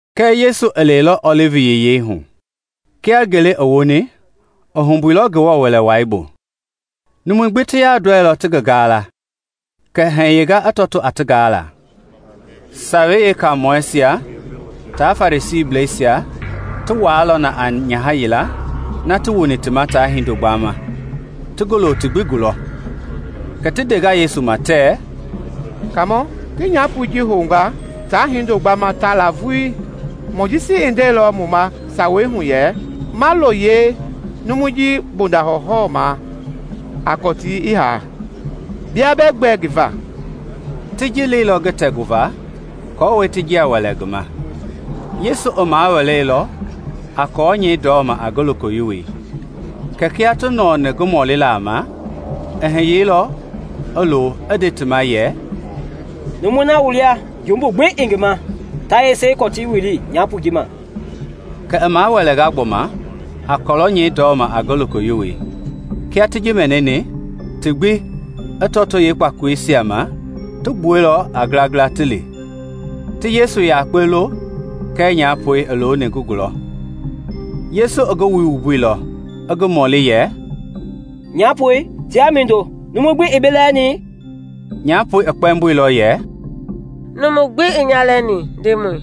Kɛɛ Yesu i lɛilɔ Ɔlivi Yiyei hu. Kia ngele i woni, i humbuilɔ Ngewɔ Wɛlei bu. Numui gbi ti yandɔɛilɔ ti ngi gala, kɛ i heinga i tɔtoo a ti gaala. Sawei Yeekaamɔisia tia Farisiisia ti wuailɔ na a nyaha yila ti wuni ti ma tia hindo gbamɛi, ti ngi lo ti gbi gulɔ. Kɛ ti ndenga Yesu ma tɛɛ, “Kaamɔ ti nyapoi ji hounga tia hindo gbamɛi ta la vulii. Mojisi i ndeilɔ mu ma Sawei hu yɛ ma lo yeenumu bondei ji hɔwɔhɔwɔmaa a kɔtii i haa. Bia bɛɛ gbɛ ngi va?” Ti ji leilɔ ngi tɛguva aako ti njia wɛlɛ ngi ma. Yesu i ma wɛleilɔ a kɔlɛi nyɛi ndɔmɛi a ngi lokoyiwoi. Kɛɛ kia ti nɔɔni ngi mɔlila ma, i hiyeilɔ, i lo, i nde ti ma yɛ, “Numui na wu lia jumbu gbi ii ngi ma, ta yese i kɔtii wili nyapoi ji ma.” Kɛ i wɛlɛnga gbɔma a kɔlɛi nyɛi ndɔmɛi a ngi lokoyiwoi. Kia ti ji mɛnini, ti gbi, i lɔto kpakoleisia ma, ti gbuɛilɔ a ngilangila ti li, ti Yesu yakpe lo kɛɛ nyapoi i looni ngi gulɔ. Yesu i ngi wui wumbuilɔ, i ngi mɔli yɛ, “Nyapoi, tiaa mindo? Numu gbi ii bi lɛɛni?” Nyapoi i kpɛmboilɔ yɛ, “Numu gbi ii nya lɛɛni, Ndemɔi.”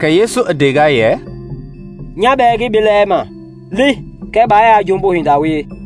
Kɛ Yesu i ndenga yɛ, “Nya bɛɛ ngii bi lɛɛma; li, kɛɛ baa yaa jumbu hinda wie.”]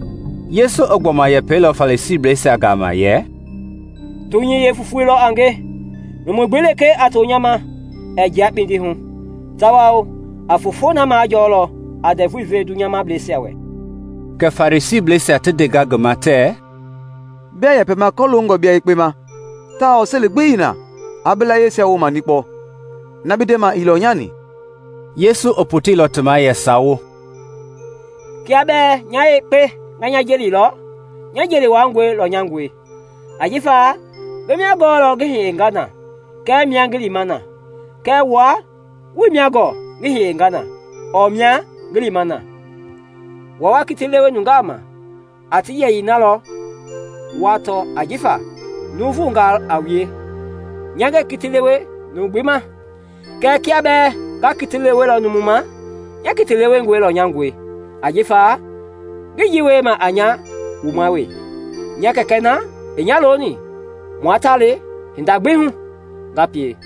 Yesu i gbɔma yɛpɛilɔ Farisiisia gama yɛ, “Dunyei yeefofoi lɔ a nge; numu gbi lekee a to nya ma ɛɛ jia kpindi hu, tawao a fofoi na majɔɔlɔ a ndɛvui ve dunyableisia wɛ.” Kɛ Farisiisia ti ndenga ngi ma tɛɛ, “Biaa yɛpɛma kɔloongɔ bia yekpe ma tawao seli gbi ii na aa bi layieisia wooma nikpɔ; na bi ndema ii lɔnyani.” Yesu i poteilɔ ti ma yɛ sawo, “Kiaa bɛɛ nya yekpe nga nya jelilɔ, nya jeli wuaangɔi lɔnyangɔe, ajifa ngi mia gɔɔlɔ ngi hiyenga na kɛɛ mia ngi lima na, kɛɛ wua wuii mia gɔɔ ngi hiyeni na ɔɔ mia ngi lima na. Wua wa kiti lewe nungaa ma a ti yɛyii na lɔ wa tɔ ajifa nuuvungaa a wue, nya ngɛɛ kiti lewe numu gbi ma. Kɛɛ kiaa bɛɛ nga kiti lewelɔ numu ma, nya kiti lewengɔi lɔnyangɔe ajifa ngii ji wiema a nya wuma wee; nya Kɛkɛi na i nya loni, mua ta le hinda gbi hu nga pie.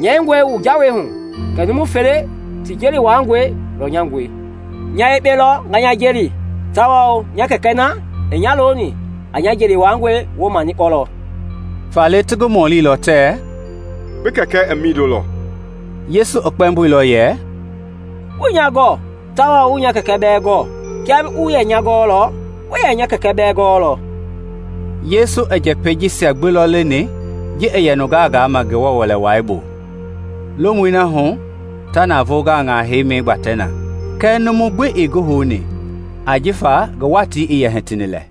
Nyɛingɔe wu jawei hu kɛ numu fele ti jeli wuaangɔi lɔnyangɔe. Nya yekpe lɔ nga nya jeli tawao nya Kɛkɛi na i nya loni a nya jeli wuaangɔi wooma nikpɔlɔ.” Faale ti ngi mɔlilɔ tɛɛ, “Bi Kɛkɛ i mindo lɔ?” Yesu i kpɛmboilɔ yɛ, “Wuii nya gɔɔ tawao wuii nya Kɛkɛ bɛɛ gɔɔ; kiaa wu yɛ nya gɔɔlɔ, wu yɛ nya Kɛkɛ bɛɛ gɔɔlɔ.” Yesu i njɛpɛi jisia gbi lɔ leni ji i yɛ nungaa gaama Ngewɔ Wɛlei bu, lomui na hu ta navoo gaŋaisia heima gbatɛ na, kɛɛ numu gbi ii ngi houni ajifa ngi watii i yɛ hitini lɛ.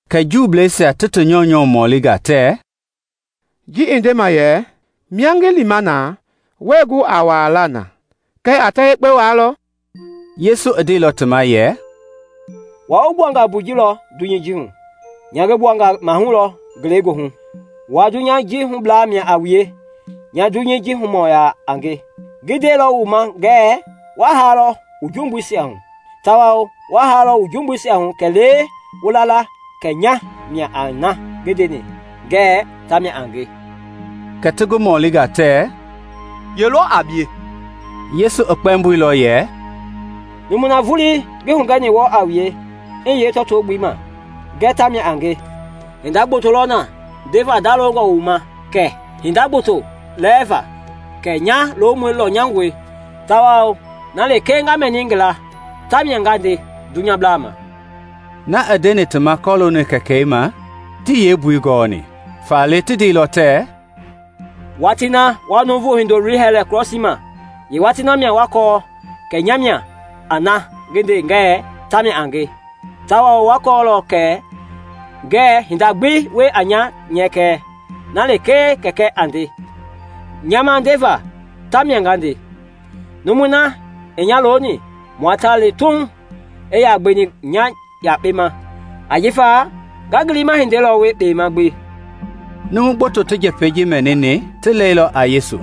Kɛ Juuisia ti ti nyɔunyɔ mɔlinga tɛɛ, “Ji i ndema yɛ ‘Mia ngi lima na wɛɛ gu a walaa na’, kɛ a ta yekpe waalɔ?” Yesu ndeilɔ ti ma yɛ, “Wua wu gbuanga mbui lɔ dunyei ji hu, nya ngi gbuanga mahui lɔ ngelegoohu; wua dunyei ji hublaa mia a wue, nya dunyei ji humɔɔ yaa a nge. Ngi ndeilɔ wu ma ngɛɛ wa haalɔ wu jumbuisia hu, tawao wa haalɔ wu jumbuisia hu kɛlee wu la la kɛ nya mia a na ngi ndeni ngɛɛ tamia a nge.” Kɛ ti ngi mɔlinga tɛɛ, “Ye lɔ a bie?” Yesu i kpɛmboilɔ yɛ, “Numui na vulii ngi hugɛni wɔɔ a wue i hiye tɔto-gbelei ma ngɛɛ ta mia a nge. Hinda gboto lɔ na ndeva ndalongɔ wu ma kɛɛ hinda gboto wu lɛɛva fa. Kɛɛ nya lomɔi lɔnyangɔe tawao na lekee nga mɛni ngi laa tamia nga nde dunyablaa ma.” Na i ndeni ti ma kɔlooni Kɛkɛi ma tii yeembui gɔni. Faale i ndeilɔ yɛ, “Watii na wa Nuuvu Hindoloi hɛlɛ krɔsii ma, yeewatii namia wa kɔɔ kɛ nya mia a na ngi ndeni ngɛɛ tamia a nge tawao wa kɔɔlɔ kɛ ngɛɛ hinda gbi wie a nya nyɛkɛ; na lekee Kɛkɛi a nde nya ma ndeva tamia nga nde. Numui na i nya loni mua ta le Tuuŋ; ii yaa gbeni nya yakpe ma, ajifa nga ngi liima hindei lɔ wie kpema gbi.” Numu gboto ti njɛpɛi jisia mɛnini ti lɛilɔ a Yesu.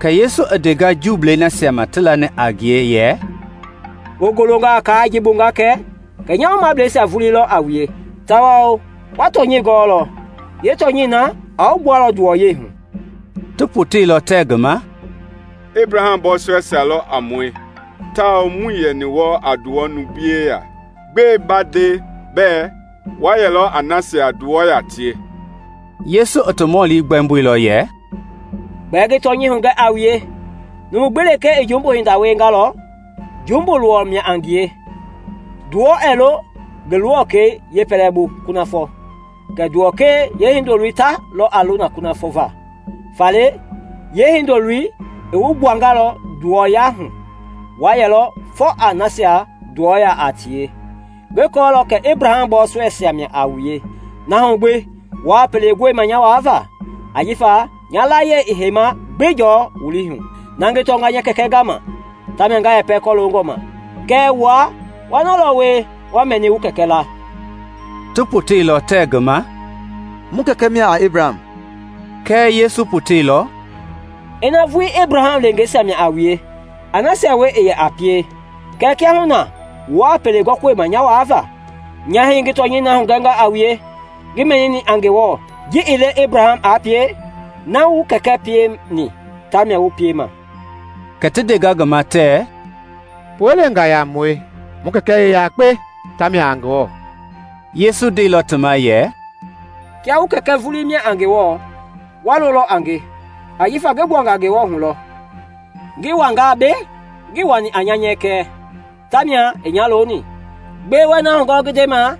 Kɛ Yesu i ndenga Juu nasia ma ti lani a ngie yɛ, “Wu golongalɔ kaai ji bu nga kɛ, kɛ nya woomableisia vulii lɔ a wue, tawao wa tɔnyɛi gɔɔlɔ, yeetɔnyɛi na a wu gbualɔ nduwɔyɛi hu.” Ti poteilɔ tɛɛ ngi ma, “Ebraham bɔɔsɔɛisia lɔ a mue tawao muii yaa yɛni wɔɔ nduwɔya hu numu gbi yeya. Gbɛe bi ndema bɛɛ ‘Wa yɛlɔ a nasia nduwɔ yaa tie?’” Yesu i ti mɔli gbɛmboilɔ yɛ, “Gbɛe ngi tɔnyɛi hugɛ a wue, numu gbi lekee i jumbu hinda wiengalɔ, jumbui luwɔ mia a ngie. Nduwɔi ɛɛ lo ngi luwɔkɛi yeepɛlɛbu kunafɔ kɛɛ nduwɔkɛi hindoloi ta a lo na lɔ kunafɔ va. Faale yeehindoloi i wu gbuangaa nduwɔyɛi hu, wa yɛlɔ fɔ a nasia nduwɔ yaa tie. Ngi kɔɔlɔ kɛ Ebraham bɔɔsɔɛisia mia a wue, na hu gbi wuaa pele gɔima nya waava ajifa nya layie ɛɛ heima gbi jɔɔ wu lii hu. Na ngi tɔnga nya Kɛkɛ gama, tamia nga yɛpɛ kɔloongɔ ma, kɛɛ wua wa na lɔ wie wa mɛni wu kɛkɛ laa.” Ti poteilɔ tɛɛ ngi ma, “Mu kɛkɛ mia a Ebraham.” Kɛɛ Yesu poteilɔ, “ina vuii Ebraham leengeisia mia a wue, a nasia wie i yɛ a pie.” kɛɛ kiahuna wuaa pele gɔima nya waava, nya hii ngi tɔnyɛi na hugɛnga a wue ngi mɛnini a Ngewɔ; ji ii le Ebraham aa pie. “Na wu kɛkɛ pieni tamia wu piema.” Kɛ ti ndenga ngi ma tɛɛ, “Pue-leengaa yaa a mue; mu kɛkɛ i yakpe, tamia a Ngewɔ.” Yesu i ndeilɔ ti ma yɛ, “Kiaa wu Kɛkɛ vulii mia a Ngewɔ, waa lolɔ a nge, ajifa ngi gbuanga Ngewɔ hu lɔ ngi wanga mbei; ngii wani a nya nyɛkɛ, ta mia i nya loni. Gbɛe wɛɛ na hugɔɔ ngi ndema?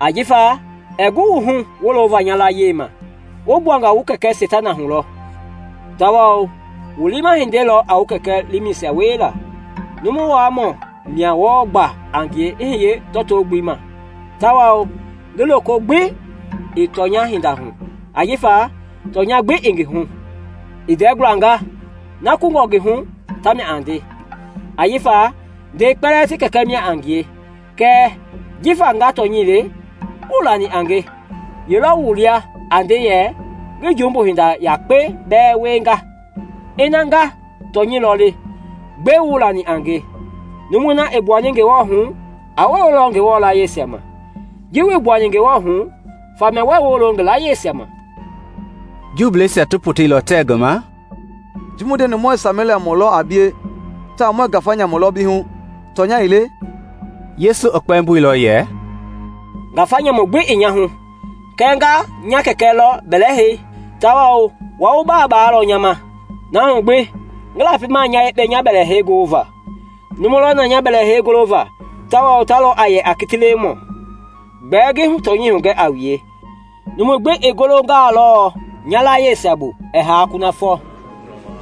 Ajifa ɛɛ gu wu hu wolova nya layie ma. Wu gbuanga wu kɛkɛ Seitana hu lɔ, tawao wu liima hindei lɔ a wu kɛkɛ liimɛisia wiela. Numu waamɔ mia wɔɔ gba a ngie i hiye tɔto-gbelei ma tawao ngi loko gbi ii tɔnyɛi hinda hu, ajifa tɔnya gbi ii ngi hu. I ndɛi gualangaa, na kungɔ ngi hu tamia a nde, ajifa ndɛi kpɛlɛɛ ti kɛkɛ mia a ngie. Kɛɛ jifa nga tɔnyɛi le, wuii lani a nge. Ye lɔ wu lia a nde yɛ ngi jumbu hinda yakpe bɛɛ wienga? Ina nga tɔnyɛi lɔ le, gbɛe wuii lani a nge? Numui na i gbuani Ngewɔ hu a wololɔ Ngewɔ layieisia ma; ji wuii gbuani Ngewɔ hu faamia wɛi wolo ngi layieisia ma.” Juuisia ti poteilɔ tɛɛ ngi ma, “Ji mu ndeni muɛɛ Sameliamɔ lɔ a bie tawao muɛɛ ngafa nyamu lɔ bi hu, tɔnya ii le?” Yesu i kpɛmboilɔ yɛ, “Ngafa nyamu gbi ii nya hu, kɛɛ nga nya Kɛkɛ lɔ bɛlɛ hei, tawao wua wa baa baalɔ nya ma. Na hu gbi ngii lapima nya yekpe nya bɛlɛhei goliva; Numu lɔ na nya bɛlɛhei gɔliva tawao ta lɔ a yɛ a kiti lewemɔi. Gbɛɛ ngi tɔnyɛi hugɛ a wue, numu gbi i golongalɔ nya layieisia bu, ɛɛ haa kunafɔ.”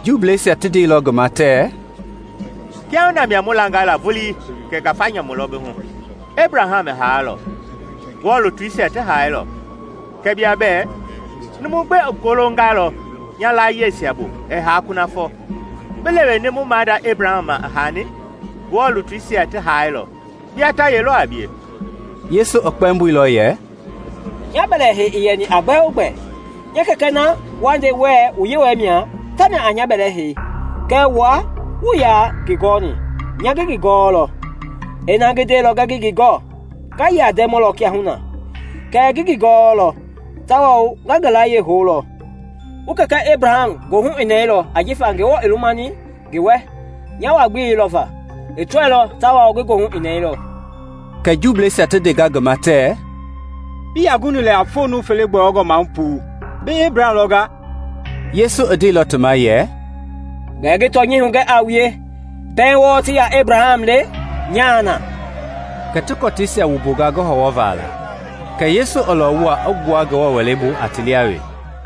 Juuisia ti ndeilɔ ngi ma tɛɛ, “Kiahuna mia mu langa la vulii kɛ ngafa nyamu lɔ bi hu. Ebraham i haailɔ; Ngewɔ lutuisia ti haailɔ; kɛɛ bia bɛɛ ‘Numu gbi i golongalɔ nya layieisia bu ɛɛ haa kunafɔ.’ Bi leweni mu maada Ebraham ma, i haani? Ngewɔ lutuisia ti haailɔ! Bia ta ye lɔ a bie?” Yesu i kpɛmboilɔ yɛ, “Nya bɛlɛ heii ii yɛni a gbɛogbɛ; nya Kɛkɛ na wa nde wuɛɛ wu Yewɔɛi mia, tamia a nya bɛlɛ hei. Kɛɛ wua wuii yaa ngi gɔni; nya ngi ngi gɔɔlɔ. Ina ngi ndeilɔ ngɛɛ ngii ngi gɔɔ, nga yɛ a ndɛmɔ lɔ kia wu na; kɛɛ ngi ngi gɔɔlɔ tawao nga ngi layie houlɔ. Wu kɛkɛ Ebraham goohu i nɛɛlɔ ajifa Ngewɔ lumani ngi wɛ nya wa-gbelei lɔva; i tɔilɔ tawao ngi goohu i nɛɛlɔ.” Kɛ Juuisia ti ndenga ngi ma tɛɛ, “Bii yaa guni lɛ a foo numu fele gbɔyɔngɔ maahu puu; bi Ebraham lɔnga?” Yesu i ndeilɔ ti ma yɛ, “Gbɛɛ ngi tɔnyɛi hugɛ a wue, pɛiŋ wɔɔ ti yaa Ebraham le, nyaa na.” Kɛ ti kɔtiisia wumbunga ngi hɔwɔva la; kɛɛ Yesu i lɔwuilɔ i gbua Ngewɔ Wɛlei bu a ti lia wee.